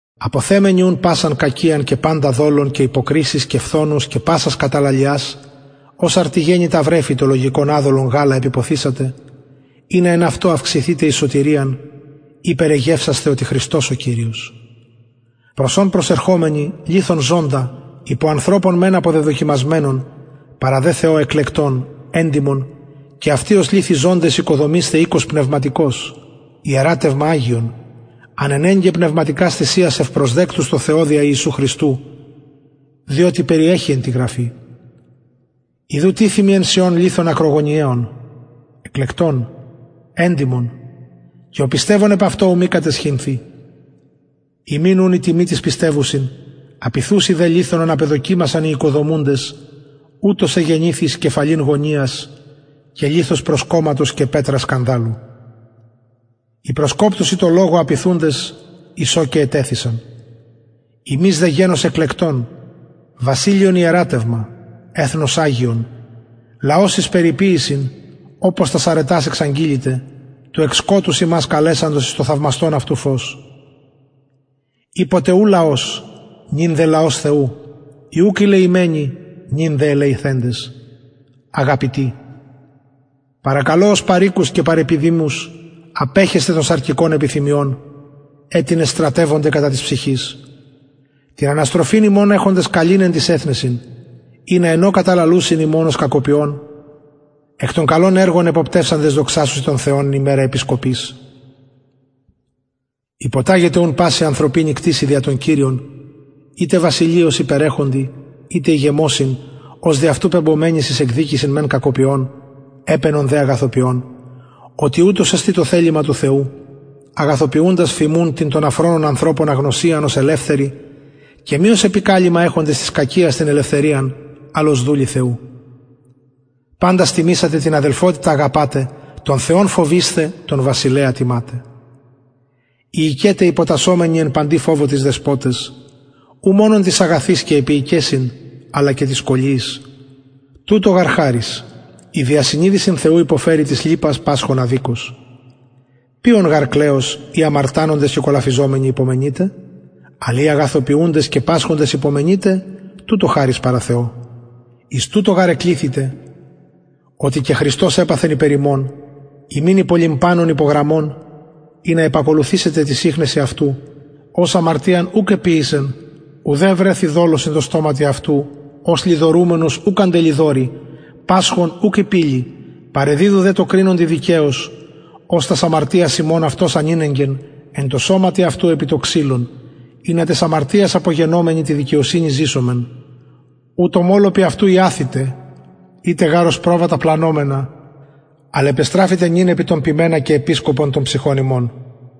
αποθεμενοι ουν πασαν κακιαν και παντα δολον και υποκρισεις και φθονους και πασας καταλαλιας ως αρτιγεννητα βρεφη το λογικον αδολον γαλα επιποθησατε ινα εν αυτω αυξηθητε ειπερ εγευσασθε οτι χρηστος ο κυριος προς ον προσερχομενοι λιθον ζωντα υπο ανθρωπων μεν αποδεδοκιμασμενον παρα δε θεω εκλεκτον εντιμον και αυτοι ως λιθοι ζωντες οικοδομεισθε οικος πνευματικος ιερατευμα αγιον ανενεγκαι πνευματικας θυσιας ευπροσδεκτους τω θεω δια ιησου χριστου διοτι περιεχει εν τη γραφη ιδου τιθημι εν σιων λιθον ακρογωνιαιον εκλεκτον εντιμον και ο πιστευων επ αυτω ου μη καταισχυνθη υμιν ουν η τιμη τοις πιστευουσιν απειθουσιν δε λιθον ον απεδοκιμασαν οι οικοδομουντες ουτος εγενηθη εις κεφαλην γωνιας και λιθος προσκομματος και πετρα σκανδαλου οι προσκοπτουσιν τω λογω απειθουντες εις ο και ετεθησαν υμεις δε γενος εκλεκτον βασιλειον ιερατευμα εθνος αγιον λαος εις περιποιησιν οπως τας αρετας εξαγγειλητε του εκ σκοτους υμας καλεσαντος εις το θαυμαστον αυτου φως οι ποτε ου λαος νυν δε λαος θεου οι ουκ ηλεημενοι νυν δε ελεηθεντες αγαπητοι παρακαλω ως παροικους και παρεπιδημους απεχεσθαι των σαρκικων επιθυμιων αιτινες στρατευονται κατα της ψυχης την αναστροφην υμων εχοντες καλην εν τοις εθνεσιν ινα εν ω καταλαλουσιν υμων ως κακοποιων εκ των καλων εργων εποπτευσαντες δοξασωσιν τον θεον εν ημερα επισκοπης υποταγητε ουν παση ανθρωπινη κτισει δια τον κυριον ειτε βασιλει ως υπερεχοντι ειτε ηγεμοσιν ως δι αυτου πεμπομενοις εις εκδικησιν κακοποιων επαινον δε αγαθοποιων οτι ουτως εστιν το θελημα του θεου αγαθοποιουντας φιμουν την των αφρονων ανθρωπων αγνωσιαν ως ελευθεροι και μη ως επικαλυμμα εχοντες της κακιας την ελευθεριαν αλλ ως δουλοι θεου παντας τιμησατε την αδελφοτητα αγαπησατε τον θεον φοβεισθε τον βασιλεα τιματε οι οικεται υποτασσομενοι εν παντι φοβω τοις δεσποταις ου μονον τοις αγαθοις και επιεικεσιν αλλα και τοις σκολιοις τουτο γαρ χαρις ει δια συνειδησιν θεου υποφερει τις λυπας πασχων αδικως ποιον γαρ κλεος ει αμαρτανοντες και κολαφιζομενοι υπομενειτε αλλ ει αγαθοποιουντες και πασχοντες υπομενειτε τουτο χαρις παρα θεω εις τουτο γαρ εκληθητε οτι και χριστος επαθεν υπερ ημων υμιν υπολιμπανων υπογραμμον ινα επακολουθησητε τοις ιχνεσιν αυτου ος αμαρτιαν ουκ εποιησεν ουδε ευρεθη δολος εν τω στοματι αυτου ος λοιδορουμενος ουκ αντελοιδορει πασχων ουκ ηπειλει παρεδιδου δε τω κρινοντι δικαιως ος τας αμαρτιας ημων αυτος ανηνεγκεν εν τω σωματι αυτου επι το ξυλον ινα ταις αμαρτιαις απογενομενοι τη δικαιοσυνη ζησωμεν ου τω μωλωπι αυτου ιαθητε ητε γαρ ως προβατα πλανωμενα αλλ επεστραφητε νυν επι τον ποιμενα και επισκοπον των ψυχων υμων